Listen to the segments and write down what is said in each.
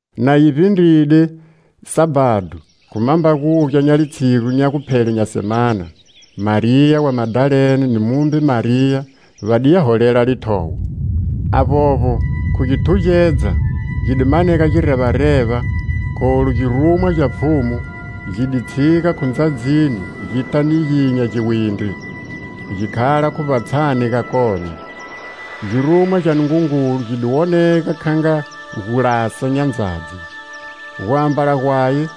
Na yi vbindride Sabhado, khu mambagugya nya litshigu nya guphele nya semana, Mariya wa Madalene ni mumbe Mariya va di ya holela lithowo. Avbovbo, khu githugedza, gi di manega girevareva, kholu girumwa gya Pfhumu, gidi tshiga khu ndzadzini gita niginya giwindri, gi khala khu vbatshani gakone. Girumwa gya Nungungulu gi di wonega kha nga gulasa nya ndzadzi; guambala gwaye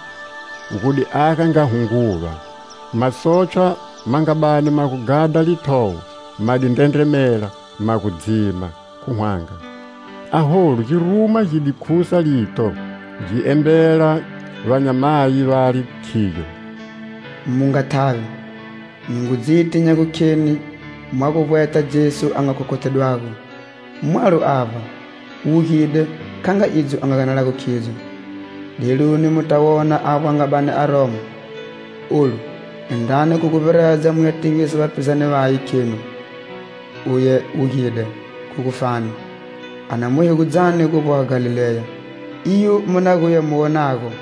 gu di aga nga hunguva. Masotshwa ma nga bani ma ghadha lithowo ma di ndrendremela, ma gu dzima, khu hwanga. Aholu girumwa gi di khusa lito, gi embela vanyamayi vale, khiyo: "Mu nga thavi; nyi ngu dziti nya gukheni mwa gu vbweta Jesu a nga khokhothedwago. Mwalo avba. Wugide, kha nga idzo a nga ganelago khidzo. Deluni muta wona avbo a nga bani a romo. Olu indrani khu guvbiredza muya tivisa vapizane vaye, khenu: 'Uye wugide khu gufani, a na mu hegudzani gu vboha Galileya. Iyo mu na guya mu wonago.'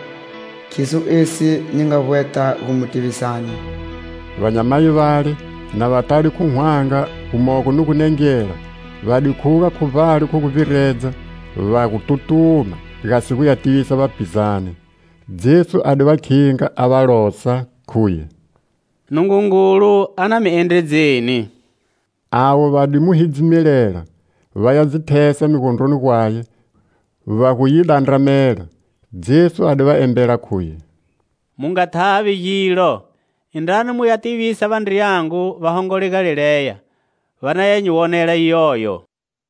Khiso esi nyi nga vbweta gu mu tivisani!" Vanyamayi vale, na va tade khu hwanga, gumogo ni gunengela, va di khuga khu vbale khu guvbiredza, va gu tutuma, gasi guya tivisa vapizane. Jesu a di va khinga, a va losa, khuye: "Nungungulu a na mi endredzeni." Avo va di mu hidzimelela, vaya dzi thesa migondroni gwaye va gu yi dandramela. Jesu a di va embela, khuye: "Mu nga thavi gilo; indrani muya tivisa vandriyangu va hongole Galileya, va na nyi wonela iyoyo."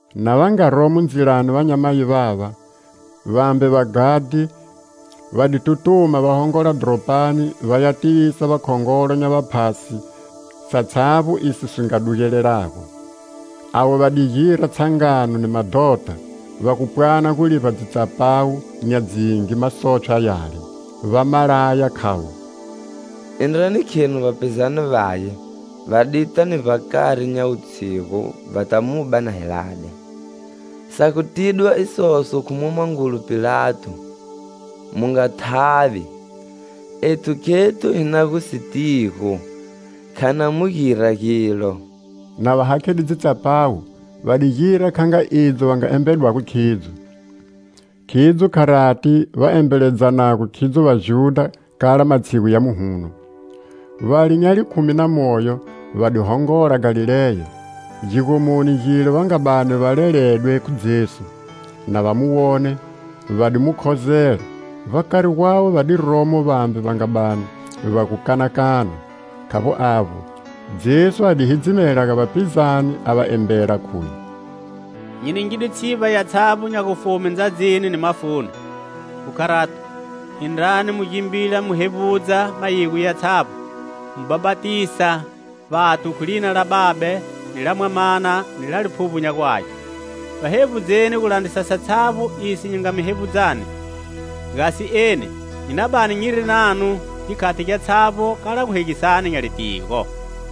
Na va nga romo ndzilani vanyamayi vava, vambe vaghadhi va di tutuma va hongola dhoropani va ya tivisa vakhongolo nya vaphasi satshavbo iso si nga dugelelago. Ava va di gira tshangano ni madhota, va gu pwana gu livba dzitsapawu nya dzingi masotshwa yale, va ma laya, khavo: "Indrani khenu vapizane vaye va di ta ni vbakari nya wutshigu vata mu ba na hi lade. Sa gu tidwa isoso khu mwamangulu Pilato, mu nga thavi, ethu khethu hi na gu si tigo. Kha na mu gira gilo." Na va hakhide dzitsapawu, va di gira kha nga idzo va nga embedwago khidzo. Khidzo kharati va embeledzanago khidzo vajudha kala matshigu ya muhuno. Vale nya likhumi na moyo va di hongola Galileya, gigomoni gile va nga bani va leledwe khu Jesu. Na va mu wone, va di mu khozela; vbakari gwawe va di romo vambe va nga bani va gu kanakana. Khavbo avbo, Jesu a di hidzimela ga vapizane, a va embela, khuye: "Nyi ningidwe tshivba yatshavbo nya gufume ndzadzini ni mafuni. Khu kharato, indrani mu gimbila mu hevbudza mayigo yatshavbo, mu bhapatisa vathu khu lina la Babe, ni la Mwamana, ni la Liphuvbo nya gu Age. Va hevbudzeni gu landrisa satshavbo iso nyi nga mi hevbudzani. Gasi eni nyi na bani nyiri nanu gikhati gyatshavbo, kala guhegisani nya litigo."